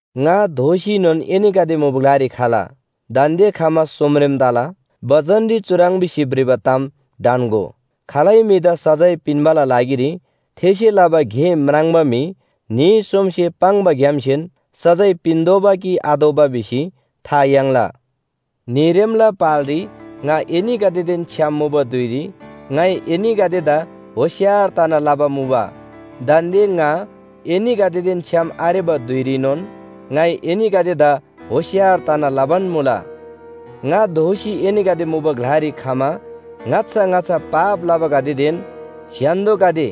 ङा दोःसीनोन एनीगदे मुबा ग्‍लारी खला, दान्‍दे खमा सोमरेम तला। बचनरी चुह्रङ् भिसी भ्रिबा ताम ढन्‍गो, “खालै म्‍हिदा सजाय पिन्‍बाला लागिरी थेसे लबा गे म्राङ्बा म्‍हि न्‍ही सोमसे पाङ्बाग्‍यामसेन सजाय पिन्‍तोःबा कि पिन्‍आतोःबा भिसी था याङ्ला।” न्‍हीरेमला पालरी ङा एनीगदेदेन छ्‌याम मुबा धुइरी ङाइ एनीगदेदा होशियार तना लबा मुबा। दान्‍दे ङा एनीगदेदेन छ्‌याम आरेबा धुइरीनोन ङाइ एनीगदेदा होशियार तना लबान मुला। ङा दोःसी एनीगदे मुबा ग्‍लारी खमा ङाच्‍छा ङाच्‍छा पाप लबागदेदेन स्‍य्‍हान्‍दोगदे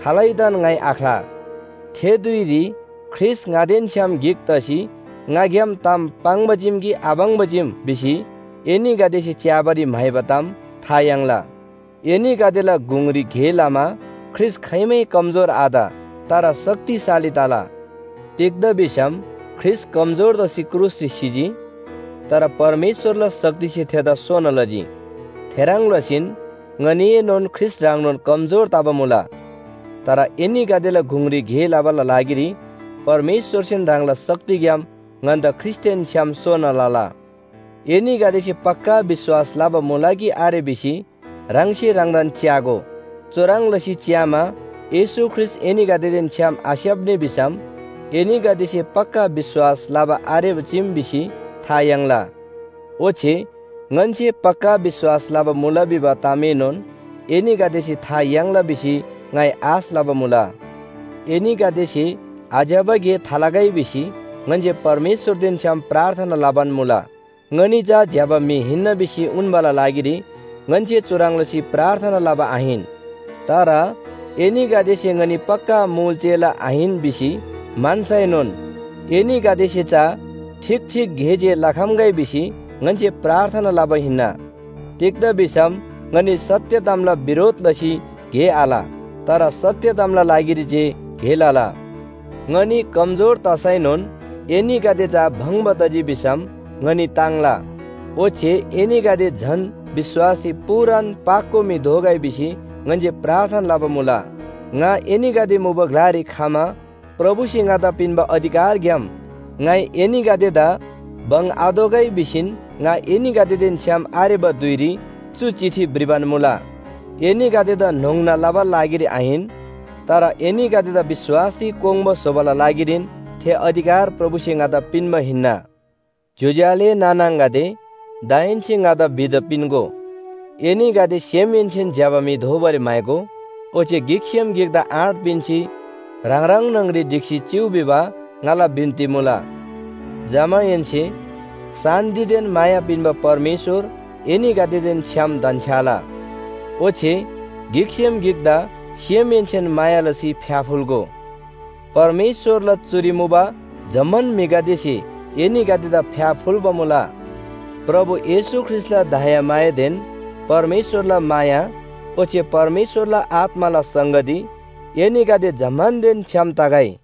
खालैदान ङाइ आख्‍ला। थे धुइरी ख्रीष्‍ट ङादेन छ्‌याम गिक तसी ङाग्‍याम ताम पाङ्बा चीम कि आपाङ्बा चीम भिसी एनीगदेसे च्‍याबारी म्‍हाइबा ताम था याङ्ला। एनीगदेला गुङरी गे लमा ख्रीष्‍ट खाइमै कमजोर आत, तर शक्तिशाली तला। तिग्‍दा भिसम ख्रीष्‍ट कमजोर तसी क्रुसरी सिजी। तर परमेश्‍वरला शक्तिसे थेदा सोना लजी। थेह्रङ् लसीन ङनीएनोन ख्रीष्‍ट ह्रङ्नोन कमजोर तबा मुला। तर एनीगदेला गुङरी गे लबाला लागिरी परमेश्‍वरसेन ह्राङला शक्तिग्‍याम ङन्‍दा ख्रीष्‍टदेन छ्‌याम सोना लला। एनीगदेसे पक्‍का विश्‍वास लबा मुला कि आरे भिसी ह्राङसे ह्राङदान च्‍यागो। चुह्रङ् लसी च्‍यामा येशू ख्रीष्‍ट एनीगदेदेन छ्‌याम आस्‍याप्‍नी भिसम एनीगदेसे पक्‍का विश्‍वास लबा आरेबा चीम भिसी था याङ्ला। ओच्‍छे ङन्‍से पक्‍का विश्‍वास लबा मुला भिबा तामएनोन एनीगदेसे था याङ्ला भिसी ङाइ आश लबा मुला। एनीगदेसे आज्‍यबा गे थालगै भिसी ङन्‍से परमेश्‍वरदेन छ्‌याम प्रार्थना लबान मुला। ङनी चा ज्‍यबा म्‍हि हिन्‍ना भिसी उन्‍बाला लागिरी ङन्‍से चुह्रङ् लसी प्रार्थना लबा आहिन। तर एनीगदेसे ङनी पक्‍का मुल चेला आहिन भिसी म्‍हन्‍सैनोन एनीगदेसे चा ठीक ठीक गे जे लखम्‍गै भिसी ङन्‍से प्रार्थना लबा हिन्‍ना। तिग्‍दा भिसम ङनी सत्‍य तामला बिरोध लसी गे आल, तर सत्‍य तामला लागिरी जे गे लला। ङनी कमजोर तसैनोन एनीगदे चा भङ्‍बा तजी भिसम ङनी ताङ्ला। ओच्‍छे एनीगदे झन विश्‍वासरी पूरान पाको म्‍हि दोगै भिसी ङन्‍से प्रार्थना लबा मुला। ङा एनीगदे मुबा ग्‍लारी खमा प्रभुसे ङादा पिन्‍बा अधिकारग्‍याम ङाइ एनीगदेदा बङ्‍‌आतोःगै भिसीन ङा एनीगदेदेन छ्‌याम आरेबा धुइरी चु चिठी भ्रिबान मुला। एनीगदेदा न्‍होङ्ना लबाला लागिरी आहिन, तर एनीगदेदा विश्‍वासरी कोङ्बा स्‍होबाला लागिरीन थे अधिकार प्रभुसे ङादा पिन्‍बा हिन्‍ना। ज्‍योज्‍यो आले नाना आङागदे, दाहेन्‍से ङादा विदा पिन्‍गो। एनीगदे सेमहेन्‍सेन ज्‍यबा म्‍हि दोबारी म्‍हाइगो, ओच्‍छे गिकसेम गिकदा आँट पिन्‍सी ह्राङ ह्राङ न्‍हङरी ढिक्‍सी चिउ भिबा ङाला बिन्‍ती मुला। जमाहेन्‍से शान्‍तिदेन माया पिन्‍बा परमेश्‍वर एनीगदेदेन छ्‌याम धन्‍छ्‌याला। ओच्‍छे गिकसेम गिकदा सेमहेन्‍सेन माया लसी फ्‍याफुल्‍गो। परमेश्‍वरला चुरी मुबा जम्‍मान म्‍हिगदेसे एनीगदेदा फ्‍याफुल्‍बा मुला। प्रभु येशू ख्रीष्‍टला दयामायादेन परमेश्‍वरला माया ओच्‍छे परमेश्‍वरला आत्‍माला संगती एनीगदे जम्‍मानदेन छ्‌याम तगै।